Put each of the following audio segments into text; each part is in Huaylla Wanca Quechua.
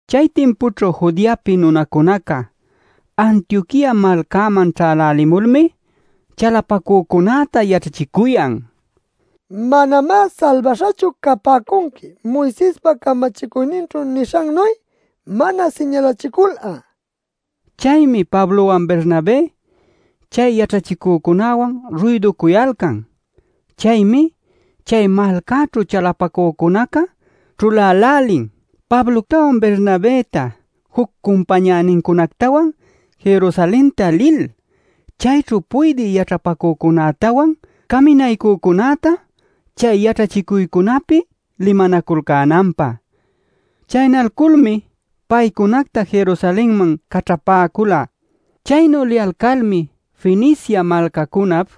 Chay timpućhu Judeapi nunacuna Antioquia malcäman ćhälälimulmi chalapacücunäta yaćhachicuyan: “Manamá salbaśhachu capäcunqui Moisespa camachicuyninćhu nishannuy mana siñalachicul'a” nil. Chaymi Pablowan Bernabé chay yaćhachicücunäwan ruyducuyalcan. Chaymi chay malcäćhu chalapacücunaca ćhulälälin Pabloctawan Bernabëta juc cumpañänincunactawan Jerusalenta lil, chayćhu puydï yaćhapacücunätawan caminaycücunäta chay yaćhachicuycunapi limanaculcänanpä. Chaynalculmi paycunacta Jerusalenman caćhapäcula. Chaynu liyalcalmi Fenicia malcacunap,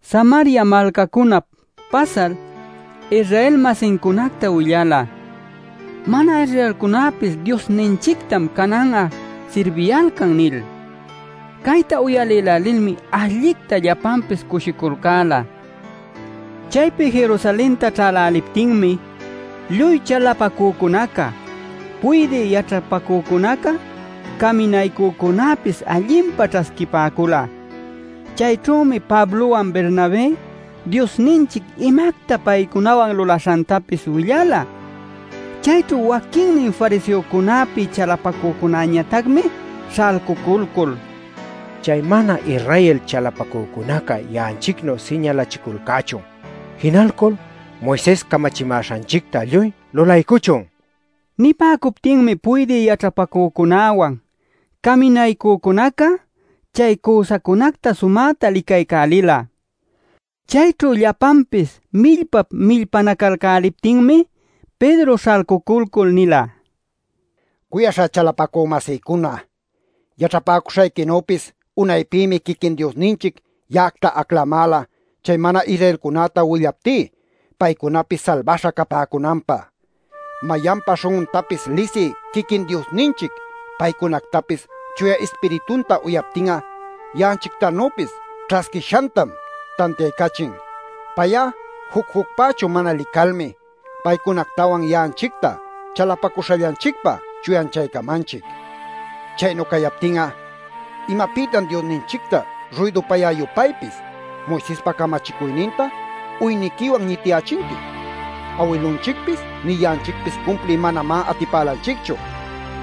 Samaria malcacunap pasal Israel-masincunacta willala: “Mana-Israelcunapis Diosninchictam canan'a sirbiyalcan” nil. Chayta uyalilmi allicta llapanpis cushiculcäla. Chaypi Jerusalenta ćhäläliptinmi, lluy chalapacücuna, puydï yaćhapacücunaca, caminaycücunäpis allinpa ćhasquipäcula. Chayćhümi Pablowan Bernabé Diosninchic imacta paycunawan lulaśhantapis willala. Chayćhu waquinnin fariseocunäpi chalapacücunañatacmi śhalcuculcul: “Chay mana-Israel chalapacücunaca ya'anchicnuy siñalachiculcächun. Jinalcul Moises camachimäśhanchicta lluy lulaycuchun” nicuyalcan. Nipäcuptinmi puydï yaćhapacücunäwan, caminaycücunaca chay cüsacunacta sumäta licaycälila. Chayćhu llapanpis millpap-millpanacalcäliptinmi Pedro śhalcuculcul nila: “Cuyaśhá chalapacü-masïcuna, yaćhapäcuśhayquinüpis unaypïmi quiquin Diosninchic ya'acta aclamäla chay mana-Israelcunäta willaptí paycunapis salbaśha capäcunanpä. Mayanpa śhun'untapis lisï quiquin Diosninchic paycunactapis Chuya Ispiritunta uyaptin'a ya'anchictanüpis ćhasquishantam tantiaycachin. Pay'a juc-jucpächu mana licalmi paycunactawan ya'anchicta chalapacuśhallanchicpa chuyanchaycamanchic. Chaynu cayaptin'a ¿imapïtan Diosninchicta ruydupayä-yupaypis, Moisespa camachicuyninta uyniquiwan ñitiyächinqui? Awilunchicpis nï ya'anchicpis cumpliy manamá atipälanchicchu.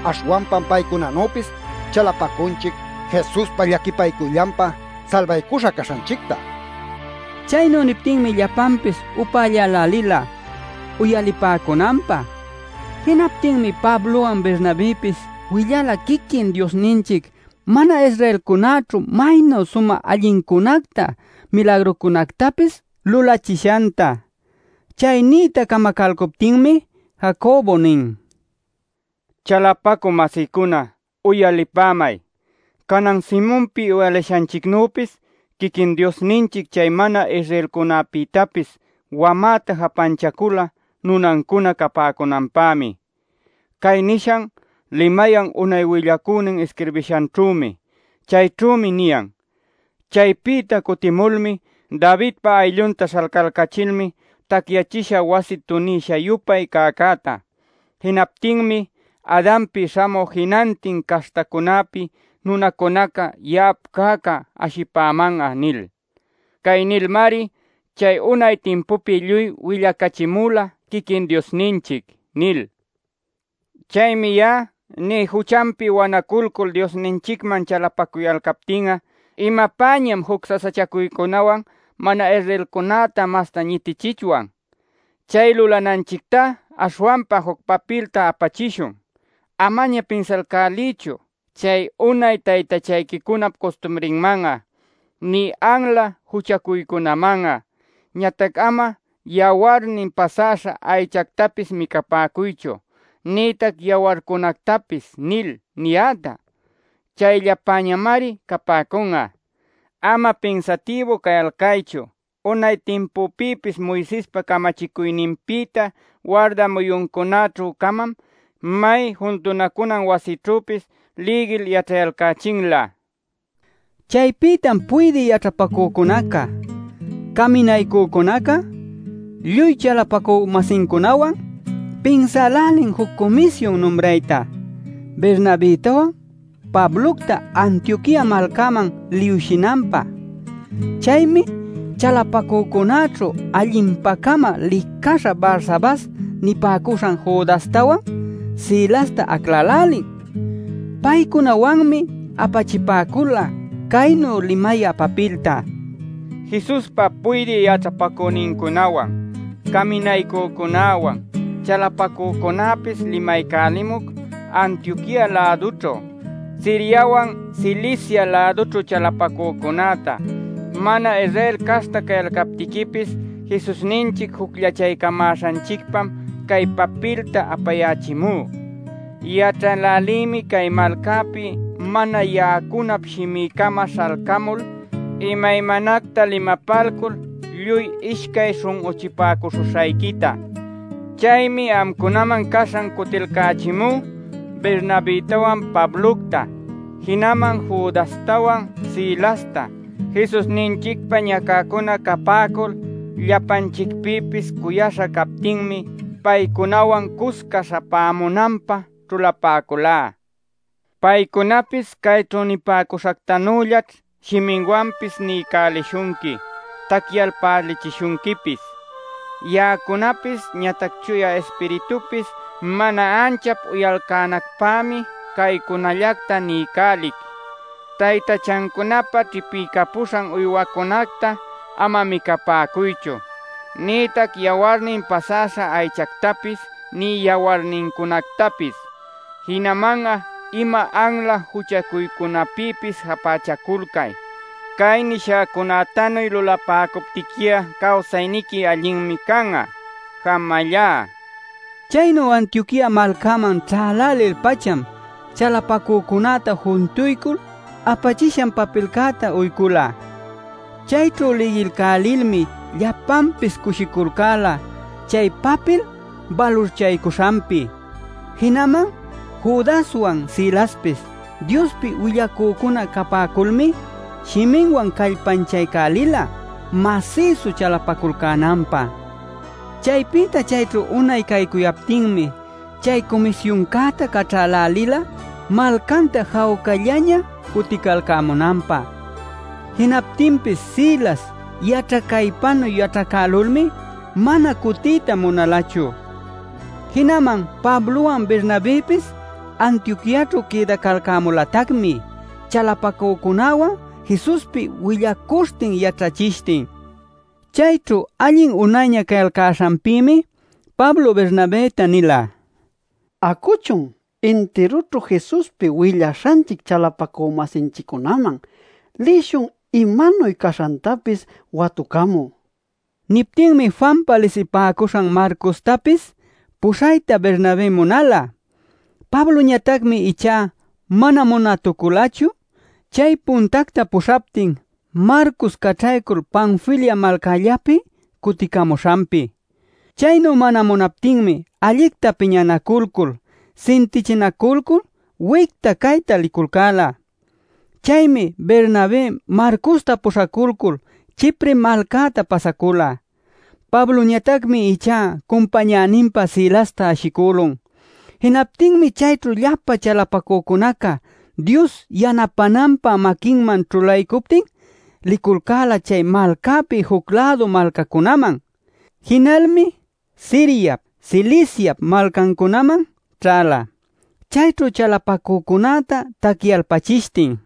Aśhwanpam paycunanüpis chalapacunchic Jesuspa llaquipacuyllanpa salbaycuśha caśhanchicta” nil. Chaynu niptinmi llapanpis upällälälila uyalipäcunanpä. Jinaptinmi Pablowan Bernabëpis willala quiquin Diosninchic mana-Israelcunäćhu maynu sumä allincunacta milagrucunactapis lulachishanta. Chay nïta camacäluptinmi Jacobo nin: “Chalapacü-masïcuna, uyalipämay. Canan Simonpi uyalishanchicnüpis quiquin Diosninchic chay mana-Israelcunäpïtapis wamäta japächacula nunancuna capäcunanpämi. Cay nishan limayan unay willacünin isquirbishanćhümi. Chayćhümi niyan: ‘ “Chaypïta cutimulmi Davidpa ayllunta śhalcalcachil tacyachishä wasi tunïsha-yupay cäcäta. Jinaptïmi Adanpi śhamü jinantin caśhtacunäpi nunacunaca ya'ap cäcá ashipäman'a” nil. Cay nilmari chay unay timpupi lluy willacachimula quiquin Diosninchic’ nil. “Chaymi ya'a ní: juchanpi wanaculcul Diosninchicman chalapacuyalcaptin'a ¿imapäñam juc sasachacuycunawan mana-Israelcunäta mastá ñitichichwan? Chay lulananchictá aśhwanpa juc papilta apachishun: ‘Amaña pinsalcäliychu chay unay taytachayquicunap custumrinman'a, nï anla juchacuycunaman'a. Ñatac ama yawarnin pasäśha aychactapis micapäcuychu, nïtac yawarcunactapis’ nil niyäta. Chayllapämari capäcun'a. [Ama pinsatïbu cayalcaychu;] unay timpupïpis Moisespa camachicuyninpïta warda muyuncunäćhü-camam may juntunacuna wasićhüpis lïgil yaćhayalcächinlä” nila. Chaypïtam puydï yaćhapacücunaca, caminaycücunaca, lluy chalapacü-masincunawan pinsälälin juc cumisyun numrayta Bernabëtawan Pablocta Antioquia malcäman liwshinanpä. Chaymi chalapacücunäćhu allinpa-cama licaśha Barsabas nipäcuśhan Judastawan, Silasta aclälälin. Paycunawanmi apachipäcula caynu limayä papilta: “Jesuspa puydï yaćhapacünincunäwan, caminaycücunäwan, chalapacücunäpis limaycälimuc Antioquia-lädućhu, Siriawan Cilicia-lädućhu chalapacücunäta. Mana-Israel caśhta cayalcaptiquipis Jesusninchic jucllachaycamäśhanchicpam cay papilta apayächimú. Yaćhälälïmi cay malcäpi mana ya'acunap shimï-cama śhalcamul, imaymanacta limapalcul, lluy ishcay śhun'uchipäcuśhuśhayquita. Chaymi amcunaman caśhan cutilcächimú Bernabëtawan Pablocta. Jinaman Judastawan Silasta Jesusninchicpa ñacäcuna capäcul llapanchicpïpis cuyaśha captinmi paycunawan cusca śhamunanpä ćhulapäculá. Paycunapis cayćhu nipäcuśhactanüllaćh shiminwanpis niycälishunqui tacyalpälichishunquipis. Ya'acunapis ñatac Chuya Ispiritupis mana anchap uyalcänacpämi caycunallacta niycälic: Taytachancunapä ćhipiycapuśhan uywacunacta ama micapäcuychu, nïtac yawarnin pasäśha aychactapis nï yawarnincunactapis. Jinaman'a ima anla juchacuycunapïpis japächaculcay. Cay nishäcunätanuy lulapäcuptiqui'a, cawsayniqui allinmi can'a. Jamallá” nil. Chaynu Antioquia malcäman ćhälälil-pacham chalapacücunäta juntuycul apachishan papilcäta uycula. Chayćhu lïgilcälilmi llapanpis cushiculcäla chay papil balurchaycuśhanpi. Jinaman Judaswan Silaspis, Diospi willacücuna capäculmi shiminwan callpanchaycälila, masïsu chalapaculcänanpä. Chaypïta chayćhu unay caycuyaptinmi chay cumisyuncäta caćhälälila malcanta jawcallaña cuticalcämunanpä. ˻ Jinaptinpis Silas yaćhacaypanuy yaćhacälulmi mana cutiyta munalachu.˼ Jinaman Pablowan Bernabëpis Antioquiaćhu quïdacalcämulatacmi chalapacücunawan Jesuspi willacuśhtin yaćhachishtin. Chayćhu allin unayña cayalcäśhanpïmi Pablo Bernabëta nila: “Acuchun, intirućhu Jesuspi willaśhanchic chalapacü-masinchiccunäman lishun imanuy caśhantapis watucamü” nil. Niptinmi Juanpa lisipäcuśhan Marcostapis puśhayta Bernabé munala. Pabloñatacmi ichá mana munätuculachu, chay puntacta puśhaptin Marcos caćhaycul Panfilia malcällapi cuticamuśhanpi. Chaynu mana munaptinmi allicta piñanaculcul, sintichinaculcul wicta cayta liculcäla. Chaymi Bernabé Marcosta puśhaculcul Chipre malcäta pasacula. Pabloñatacmi ichá cumpañäninpä Silasta ashicülun. Jinaptinmi chayćhu llapa chalapacücunaca Dios yanapänanpä maquinman ćhulaycuptin liculcäla chay malcapi juc-lädu malcacunaman. Jinalmi Siriap, Ciliciap malcancunaman ćhäla, chayćhu chalapacücunäta tacyalpachishtin.